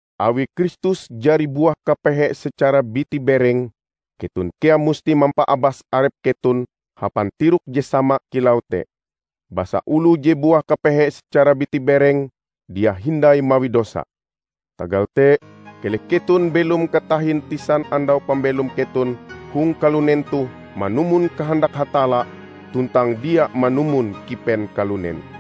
Awi Kristus jari buah kapehe secara biti bereng, keton kea musti mampaabas arep keton hapan tirok je sama kilau te. Basa oloh je buah kapehe secara biti bereng, dia hindai mawi dosa. Tagal te, keleh keton belom katahin tisan andau pambelom keton hong kalunen toh manumon kahandak Hatalla, tuntang dia manumon kipen kalunen.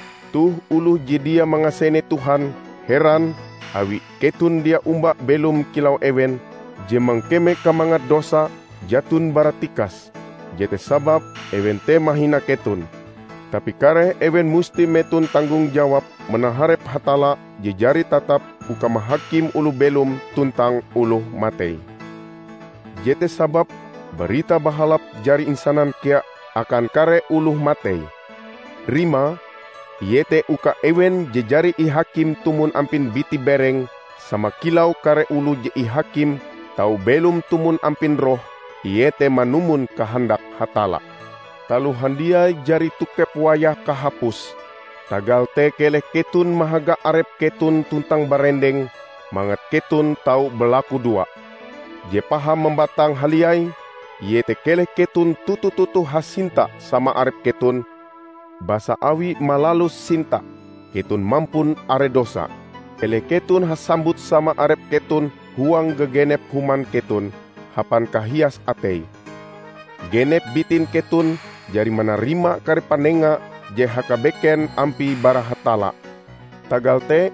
Toh oloh je dia mangasene Tuhan, heran awi keton dia omba belom kilau ewen, je mangkeme kamangat dosa jaton bara tikas. Jete sababe ewen te mahina keton. Tapi kareh ewen musti meton tanggung jawab manaharep Hatalla je jari tatap uka mahakim oloh belom tuntang oloh matei. Jete sababe Barita Bahalap jari insanan kea akan kare oloh matei. Rimae, iete uka ewen je jari ihakim tumon ampin biti-bereng -- sama kilau kare oloh je ihakim -- tau belom tumon ampin roh, iete manumon kahandak Hatalla. Taloh handiai jari tokep wayah kahapuse, tagal te keleh keton mahaga arep keton tuntang barendeng, mangat keton tau balakudoa. Je paham mambatang haliai, iete keleh keton toto-toto hasinta sama arep keton, basa awi malalus sinta, keton mampun are dosa. Keleh keton hasambut sama arep keton huang gagenep human keton, hapan kahias atei. Genep bitin keton jari manarima kare panenga je hakabeken ampie bara Hatalla. Tagal te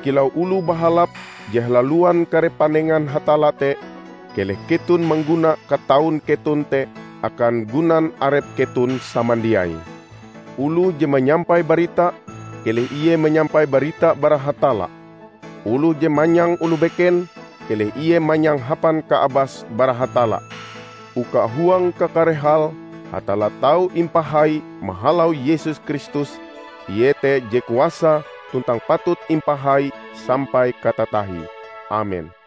kilau oloh bahalap je halaluan kare panengan Hatalla te, keleh keton mangguna kataun keton te akan gunan arep keton samandiai. Oloh je manyampai barita, keleh ie manyampai barita bara Hatalla; oloh je manyang oloh beken, keleh ie manyang hapan kaabas bara Hatalla, uka huang kakare hal Hatalla tau imapahai mahalau Yesus Kristus. Ie te je kuasa tuntang patut impahai sampai katatahie. Amen.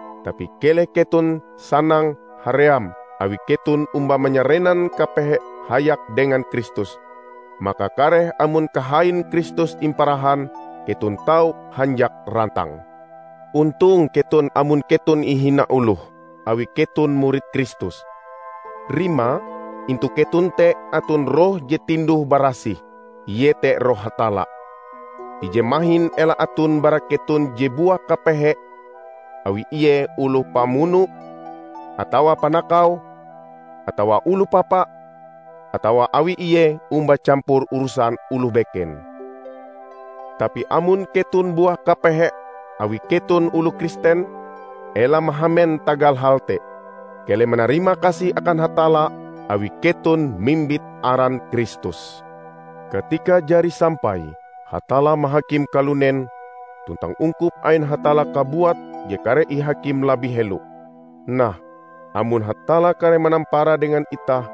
Tapi keleh keton sanang haream awi keton omba manyarenan kapehe hayak dengan Kristus. Maka kareh amon kahain Kristus imparahan, keton tau hanjak rantang. Ontong keton amon keton ihina oloh awi keton murid Kristus. Rimae, intu keton te aton Roh je tinduh barasih, iete Roh Hatalla. Ije mahin ela aton bara keton je buah kapehe awi ie oloh pamuno, atawa panakau, atawa oloh papa, atawa awi ie omba campur urusan oloh beken. Tapi amon keton buah kapehe awi keton oloh Kristen, ela mahamen tagal hal te. Keleh manarimakasih akan Hatalla, awi keton mimbit aran Kristus. Katikae jari sampai, Hatalla mahakim kalunen. Tuntang ungkup ain Hatalla kabuat je kareh ihakim labih helo. Nah, amon Hatalla kareh manampara dengan itah,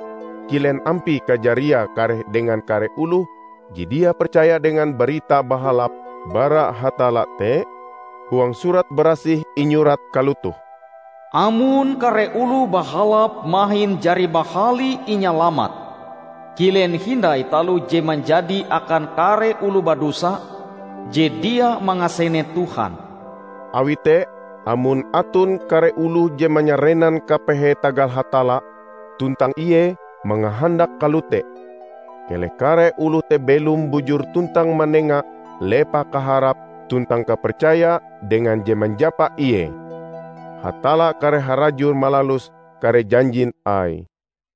kilen ampie kajariae kareh dengan kare oloh je dia percaya dengan Barita Bahalap bara Hatalla te? Huang Surat Barasih inyurat kalotoh, "Amon kare oloh bahalap mahin jari bahali inyalamat, kilen hindai taloh je manjadi akan kare oloh badosa je dia mangasene Tuhan!" Awi te, amon aton kare oloh je manyarenan kapehe tagal Hatalla, tuntang ie mangahandak kalote, keleh kare oloh te belom bujur tuntang manenga lepah kaharape tuntang kapercayae dengan Je Manjapa ie. Hatalla kareh harajur malalus kare janjin Aie.